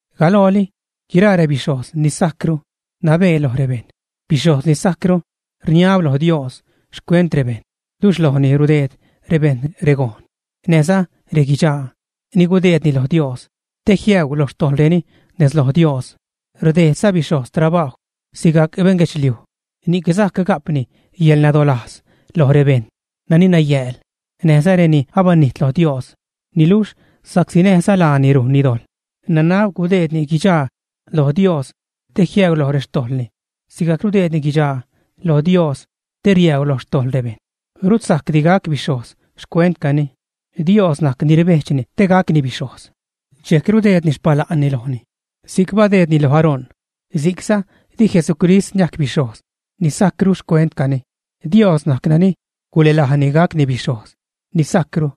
Galooli guiraa rebixhojz ni sajcru nabee lo rebejṉ. Bixhojz ni sajcru rniab lo Dios xcuent rebejṉ. Luxh lojni rudeed rebejṉ regon näjza reguidxaa ni gudeedni lo Dios te jiäu lo xtojḻreni nez lo Dios. Rdejdza bixhojz trabajw sigajc beṉguedxliuj, ni'c sajc ga'pni yäḻnadolajz loj rebejṉ nani nayääl näjza reni abanijt lo Dios. Niluxh sa'csi näjza laani rujnni dojḻ, nanab gudeedni guidxaa lo Dios te jiäu lo rextojḻni sigajc rudeedni guidxaa lo Dios te riäu lo xtojḻ rebejṉ. Rut sajcdi gac bixhojz xcuentcani. Dios najc ni rbejdxni te gacni bixhojz, dxejc rudeedni xpala'nni lojni si'c badeednini lo Aarón. Si'cza di Jesucrist niajc bixhojz ni sajcru xcuentcani. Dios najc nani gulälajni gacni bixhojz ni sajcru,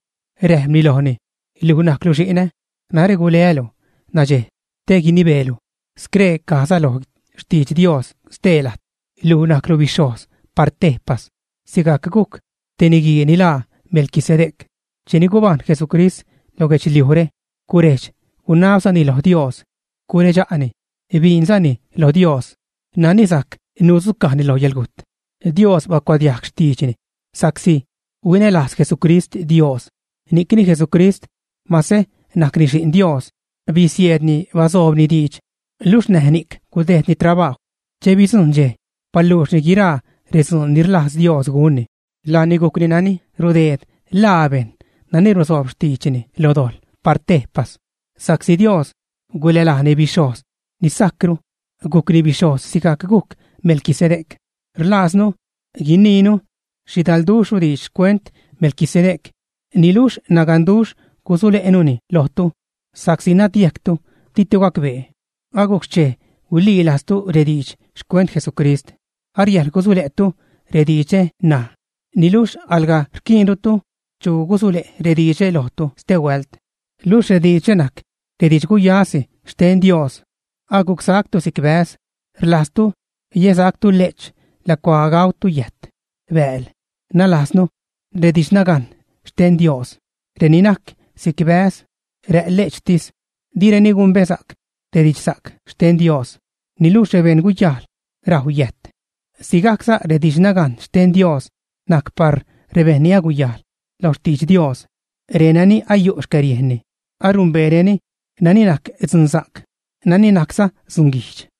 räjpni lojni: Luj najclu Xi'nä, narä guleälu nadxej te guinibeelu. Scree cajza lo xtidx Dios stee lajt: Luj najclu bixhojz par tejpas sigajc gujc te niguii ni laa Melquisedec. Cheni gubajṉ Jesucrist lo guedxliujre, gurejdx-gunabzani lo Dios, guredxa'ni biinzani lo Dios nani sajc nudzucajni lo yäḻgujt; Dios bacuadiajg xtiidxni sa'csi huinälajz Jesucrist Dios. Ni'cni Jesucrist mase najcni Xi'n Dios bisieedni basoobni diidx luxh näj ni'c gudejdni trabajw. Che bidzujṉ dxej baluuxni guiraa redzuun ni rlajz Dios gunni, laani gujcni nani rudeed ḻaa bejṉ nani rusoob xtiidxni lo dojḻ par tejpas sa'csi Dios gulälajni bixhojz ni sajcru, gujcni bixhojz sigajc gujc Melquisedec. Rlajznu guiniinu xhidalduxhru diidx xcuent Melquisedec, niluxh naganduxh gusule'nuni lojtu sa'csi nadyejctu, ditu gacbee. Agujc xchej huililajztu rediidx xcuent Jesucrist. Ariäjḻ gusule'tu rediidxre ṉaj, niluxh alga rquiinrutu chu gusule' rediidxre lojtu stehuält, luxh rediidxre najc rediidx guyasi xten Dios. Agucsactu si'c bäz. Rlajztu yäsactu le'ch lacuaa gautu yäjt, bääl; nalajznu, redidxnagajn xten Dios. Reni najc si'c bäz, rä' le'chtis, direni gumbesa'c redidxsa'c xten Dios. Niluxh rebeṉ guyajl rajw yäjt. Sigajcza redidxnagajn xten Dios najc par rebejṉ ni aguyajl lo xtidx Dios, renani ayu' xcäriejnni, arumbeereni nani najc dzunsa'c, nani najcza dzunguijdx.